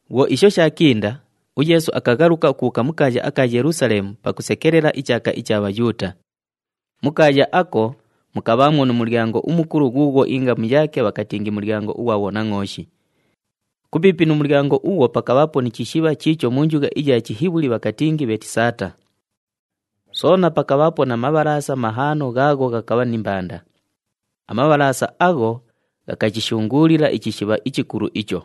Bhwo isho shaakinda, uYeesu akaghaluka ukubhuuka mu kaaya aka Yelusaleemu pakusekelela ichaaka icha Bhayuuta. Mu kaaya ako, mukabhaamwo nu mulyango umukulu ghuughwo ingamu yaake bhakatingi Mulyango ughwa Bhonangʼooshi. Kupiipi nu mulyango ughwo pakabhaapo ni chishibha chiicho mu njugha iya Chihibhuli bhakatingi Bheetisata. Soona pakabhaapo na mabhalaasa mahaano ghaagho ghakabha ni mbanda. Amabhalaasa agho ghakachishunguulila ichishibha ichikulu icho.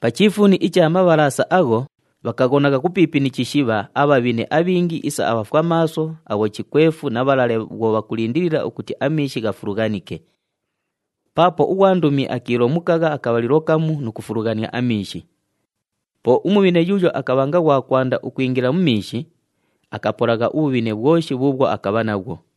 Pa chiifuuni icha mabhalaasa agho, bhakaghonagha kupiipi ni chishibha abhabhine abhingi isa abhafwamaaso, abhochikwefu na bhalale [bhwo bhakulindilila ukuti amiishi ghafulughanike. Paapo ughwandumi akiilomukagha akabhalilo kamu nu kufulughania amiishi. Po umubhine yuuyo akabhanga ghwa kwanda ukwingila mu miishi, akapolagha ubhubhine bhwoshi bhuubhwo akabha nabhwo].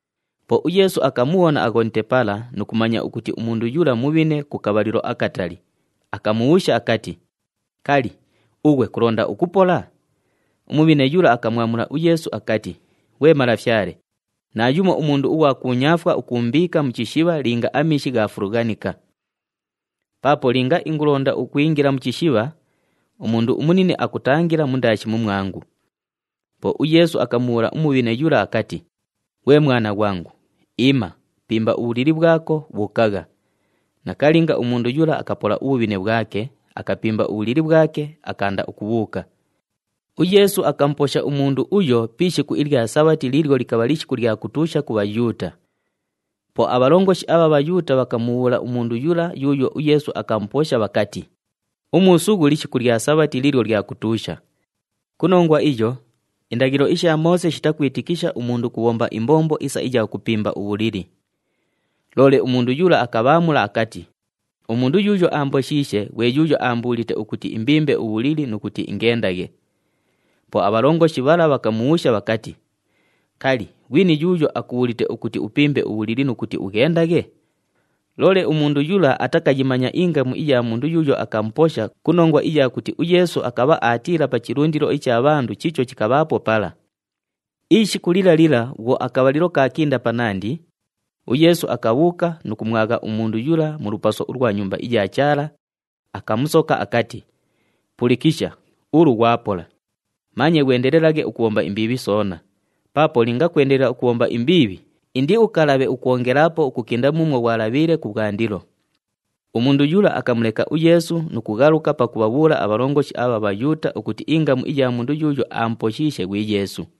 Po uYeesu akamubhona aghonite pala nu kumanya ukuti umundu yula mubhine ku kabhalilo akatali, akamubhuusha akati, “Kali, ughwe kulonda ukupola?” Umubhine yula akamwamula uYeesu akati, “Ghwe Malafyale, naayumo umundu ughwa kuunyaafwa ukuumbiika mu chishibha linga amiishi ghaafulughanika. Paapo linga ingulonda ukwingila mu chishibha, umundu umunine akutangila mundaashi mumwangu.” Po uYeesu akamubhuula umubhine yula akati, “Ghwe mwana ghwangu, iima, pimba ubhulili bhwako, bhuukagha.” Nakalinga, umundu yula akapola ubhubhine bhwake, akapimba ubhulili bhwake, akaanda ukubhuuka. UYeesu akamuposha umundu uyo pi ishiku ilya Sabhati liilyo likabha lishiku lya kutuusha ku Bhayuuta. Po abhalongoshi abha Bhayuuta bhakamubhuula umundu yula yuuyo uYeesu akamuposha bhakati, “Umuusughu lishiku lya Sabhati liilyo lya kutuusha. Ku nongwa iyo indaghilo isha Moose shitakwitikisha umundu ukubhomba imbombo isa iya kupimba ubhulili.” Loole umundu yula akabhaamula akati, “Umundu yuuyo aamboshiishe ghwe yuuyo aambuulite ukuti imbimbe ubhulili nu kuti ingendaghe.” Po abhalongoshi bhala bhakamubhuusha bhakati, “Kali, ghwini yuuyo akubhuulite ukuti upimbe ubhulili nu kuti ughendaghe?” Loole umundu yula atakayimanya ingamu iya mundu yuuyo akamuposha ku nongwa iya kuti uYeesu akabha aatiila pa chilundilo icha bhandu chiicho chikabhaapo pala. Ishiku lila lila bhwo akabhalilo kaakinda panandi, uYeesu akabhuuka nu kumwagha umundu yula mu lupaso ulwa Nyumba iya Chaala, akamusoka akati, “Pulikisha, ulu ghwapola. Manye ghwendelelaghe ukubhomba imbiibhi soona, paapo linga kwendelela ukubhomba imbiibhi, indiukalabhe ukwongelaapo ukukinda muumwo ghwalabhiile kubhwandilo.” Umundu yula akamuleka uYeesu nu kughaluka pakubhabhuula abhalongoshi abha Bhayuuta ukuti ingamu iya mundu yuuyo aamuposhiishe ghwi Yeesu.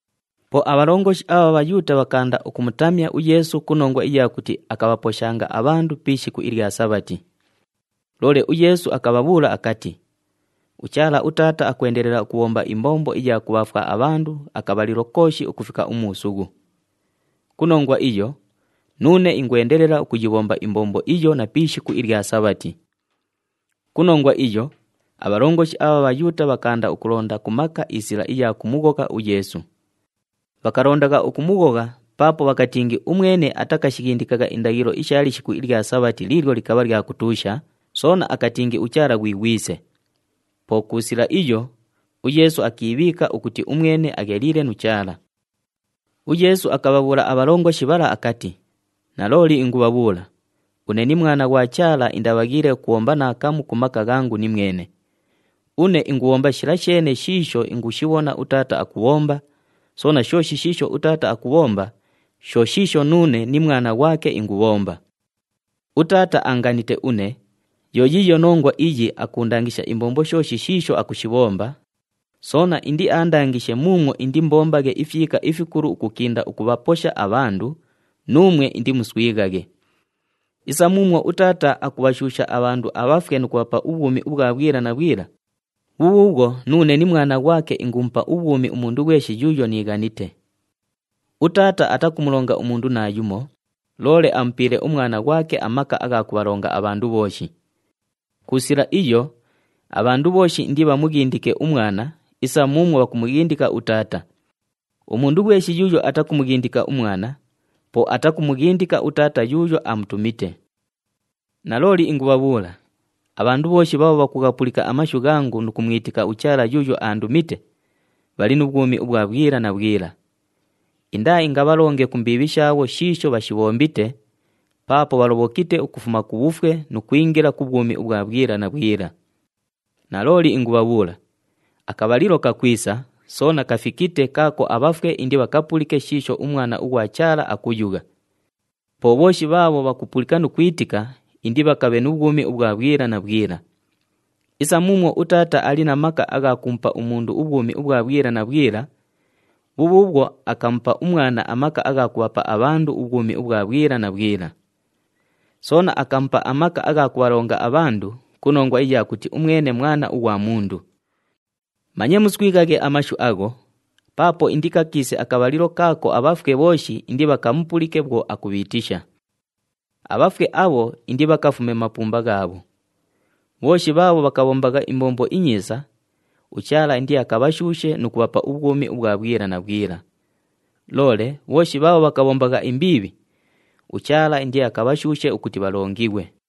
Po abhalongoshi abha Bhayuuta bhakaanda ukumutamya uYeesu ku nongwa iya kuti akabhaposhanga abhandu pi ishiku ilya Sabhati. Loole uYeesu akabhabhuula akati, “UChaala, uTaata akwendelela ukubhomba imbombo iya kubhaafwa abhandu akabhalilo kooshi ukufika umuusughu. Ku nongwa iyo, nuune ingwendelela ukuyibhomba imbombo iyo na pi ishiku ilya Sabhati.” Ku nongwa iyo, abhalongoshi abha Bhayuuta bhakaanda ukulonda ku maka isila iya kumughogha uYeesu. Bhakalondagha ukumughogha paapo bhakatingi umwene atakashighindikagha indaghilo isha lishiku ilya Sabhati liilyo likabha lya kutuusha, soona akatingi uChaala ghwi Ghwise. Po ku sila iyo, uYeesu akiibhiika ukuti umwene agheliile nu Chaala. UYeesu akabhabhuula abhalongoshi bhala akati, “Nalooli ingubhabhuula, une ni Mwana ghwa Chaala indabhaghiile ukubhomba naakamu ku maka ghangu nimwene. Une ingubhomba shila sheene shiisho ingushibhona uTaata akubhomba, soona shooshi shiisho uTaata akubhomba, sho shiisho nuune ni Mwana ghwake ingubhomba. UTaata aanganite une, yo yiiyo nongwa iyi akuundangisha imbombo shooshi shiisho akushibhomba, soona indiandangishe muumwo indiimbombaghe ifyika ifikulu ukukinda ukubhaposha abhandu, nuumwe indimuswighaghe. Isa muumwo uTaata akubhashuusha abhandu abhafwe nu kubhapa ubhwumi ubhwa bhwila na bhwila, bhubhuubhwo nuune ni Mwana ghwake ingumupa ubhwumi umundu ghweshi yuuyo niighanite. UTaata atakumulonga umundu naayumo, loole amupiile uMwana ghwake amaka agha kubhalonga abhandu bhooshi. Ku sila iyo, abhandu bhooshi indibhamughindike uMwana isa muumwo bhakumughindika uTaata. Umundu ghweshi yuuyo atakumughindika uMwana, po atakumughindika uTaata yuuyo aamutumite. “Nalooli ingubhabhuula, abhandu bhooshi bhaabho bhakughapulika amashu ghangu nu kumwitika uChaala yuuyo aandumite, bhali nu bhwumi ubhwa bhwila na bhwila. Indaaingabhalonge ku mbiibhi shaabho shiisho bhashibhombite, paapo bhalobhokite ukufuma ku bhufwe nu kwingila ku bhwumi ubhwa bhwila na bhwila. Nalooli ingubhabhuula, akabhalilo kakwisa, soona kafikite kaako abhafwe indibhapulike shiisho uMwana ughwa Chaala akuyugha. Po bhooshi bhaabho bhakupulika nu kwitika indibhakabhe nu bhwumi ubhwa bhwila na bhwila. Isa muumwo uTaata ali na maka agha kumupa umundu ubhwumi ubhwa bhwila na bhwila, bhubhuubhwo akamupa uMwana amaka agha kubhapa abhandu ubhwumi ubhwa bhwila na bhwila. Soona akamupa amaka agha kubhalonga abhandu ku nongwa iya kuti umwene Mwana ughwa Mundu. Manye muswighaghe amashu agho, paapo indikakiise akabhalilo kaako abhafwe bhooshi indibhakamupulike bhwo akubhiitisha. Abhafwe abho indibhakafume mu mapumba ghaabho. Bhooshi bhaabho bhakabhombagha imbombo inyiisa, uChaala indiakabhashuushe nu kubhapa ubhwumi ubhwa bhwila na bhwila. Loole bhooshi bhaabho bhakabhombagha imbiibhi, uChaala indiakabhashuushe ukuti bhalongighwe.”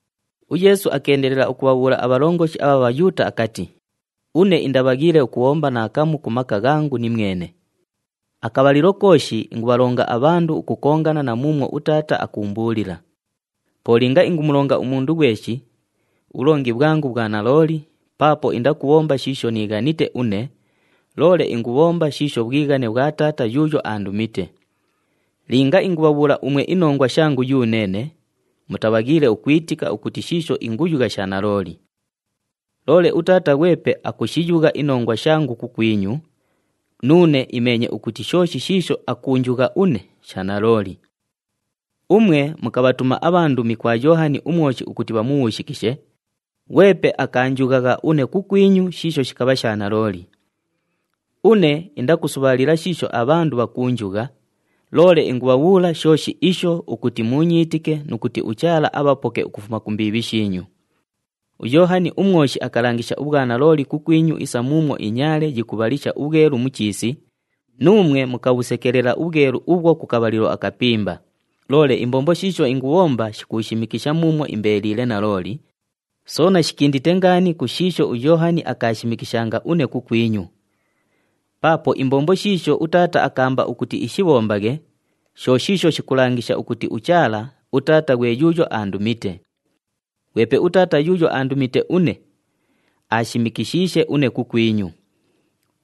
UYeesu akeendelela ukubhabhuula abhalongoshi abha Bhayuuta akati, “Une indabhaghiile ukubhomba naakamu ku maka ghangu nimwene. Akabhalilo kooshi ingubhalonga abhandu ukukongana na muumwo uTaata akuumbuulila. Po linga ingumulonga umundu ghweshi, ubhulongi bhwangu bhwa nalooli paapo indakubhomba shiisho niighanite une, loole ingubhomba shiisho bhwighane bhwa Taata yuuyo aandumite. Linga ingubhabhuula umwe inongwa shangu yuneene, mutabhaghiile ukwitika ukuti shiisho inguyugha sha nalooli. Loole uTaata ghwepe akushiyugha inongwa shangu kukwinyu, nuune imeenye ukuti shooshi shiisho akuunjugha une sha nalooli. Umwe mukabhatuma abhandumi kwa Yoohani uMwoshi ukuti bhamubhuushikishe, ghwepe akaanjughagha une kukwinyu shiisho shikabha sha nalooli. Une indakusubhaalila shiisho abhandu bhakuunjugha, loole ingubhabhuula shooshi isho ukuti muunyiitike nu kuti uChaala abhapoke ukufuma ku mbiibhi shiinyu. UYoohani uMwoshi akalangisha ubhwanalooli kukwinyu isa muumwo inyaale yikubhalisha ubhwelu mu chiisi, nuumwe mukabhusekelela ubhwelu ubhwo ku kabhalilo akapimba. Loole imbombo shiisho ingubhomba shikuushimikisha muumwo imbeeliile nalooli, soona shikindite ngaani ku shiisho uYoohani akaashimikishanga une kukwinyu. Paapo imbombo shiisho uTaata akaamba ukuti ishibhombaghe sho shiisho shikulangisha ukuti uChaala, uTaata ghwe yuuyo aandumite. Ghwepe uTaata yuuyo aandumite une, aashimikishiishe une kukwinyu.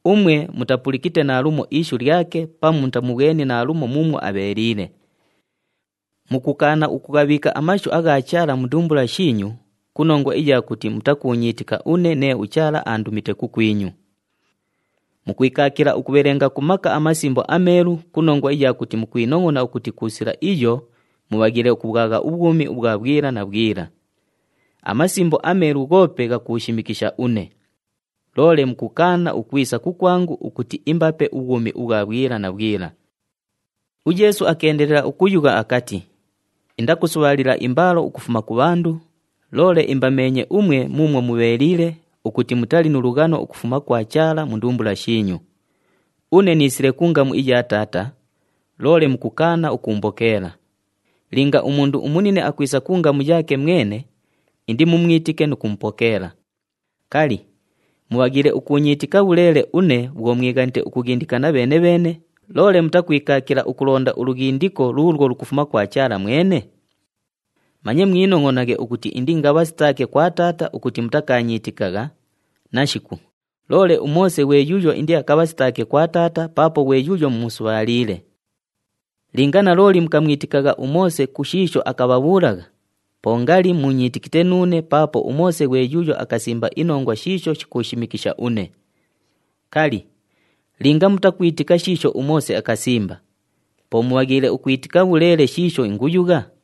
Umwe mutalipulikite naalumo ishu lyake pamu mutamubhweni naalumo muumwo abheeliile. Mukukaana ukughabhiika amashu agha Chaala mu ndumbula shiinyu ku nongwa iya kuti mutakuunyiitika une nee uChaala aandumite kukwinyu. Mukwikaakila ukubhelenga ku maka aMasimbo aMeelu ku nongwa iya kuti mukwinongʼona ukuti ku sila iyo mubhaghiile ukubhwagha ubhwumi ubhwa bhwila na bhwila. AMasimbo aMeelu ghoope ghakuushimikisha une. Loole mukukaana ukwisa kukwangu ukuti imbape ubhwumi ubhwa bhwila na bhwila.” UYeesu akeendelela ukuyugha akati, “Indakusubhaalila imbaalo ukufuma ku bhandu, loole imbameenye umwe muumwo mubheeliile ukuti mutali nu lughano ukufuma kwa Chaala mu ndumbula shiinyu. Une niisile ku ngamu iya Taata, loole mukukaana ukuumbokeela. Linga umundu umunine akwisa ku ngamu yaake mwene indimumwitike nu kumupokeela. Kali, mubhaghiile ukuunyiitika bhuleele une bhwo mwighanite ukughindikana bheene-bheene, loole mutakwikaakila ukulonda ulughindiko luulwo lukufuma kwa Chaala mwene? Manye mwinongʼonaghe ukuti indiingabhasitaake kwa Taata ukuti mutakaanyiitikagha, nashiku, loole uMoose ghwe yuuyo indiakabhasitaake kwa Taata paapo ghwe yuuyo mumusubhaaliile. Linga nalooli mukamwitikagha uMoose ku shiisho akabhabhuulagha, po ngali muunyiitikite nuune paapo uMoose ghwe yuuyo akasimba inongwa shiisho shikuushimikisha une. Kali, linga mutakwitika shiisho uMoose akasimba, po mubhaghiile ukwitika bhuleele shiisho inguyugha?”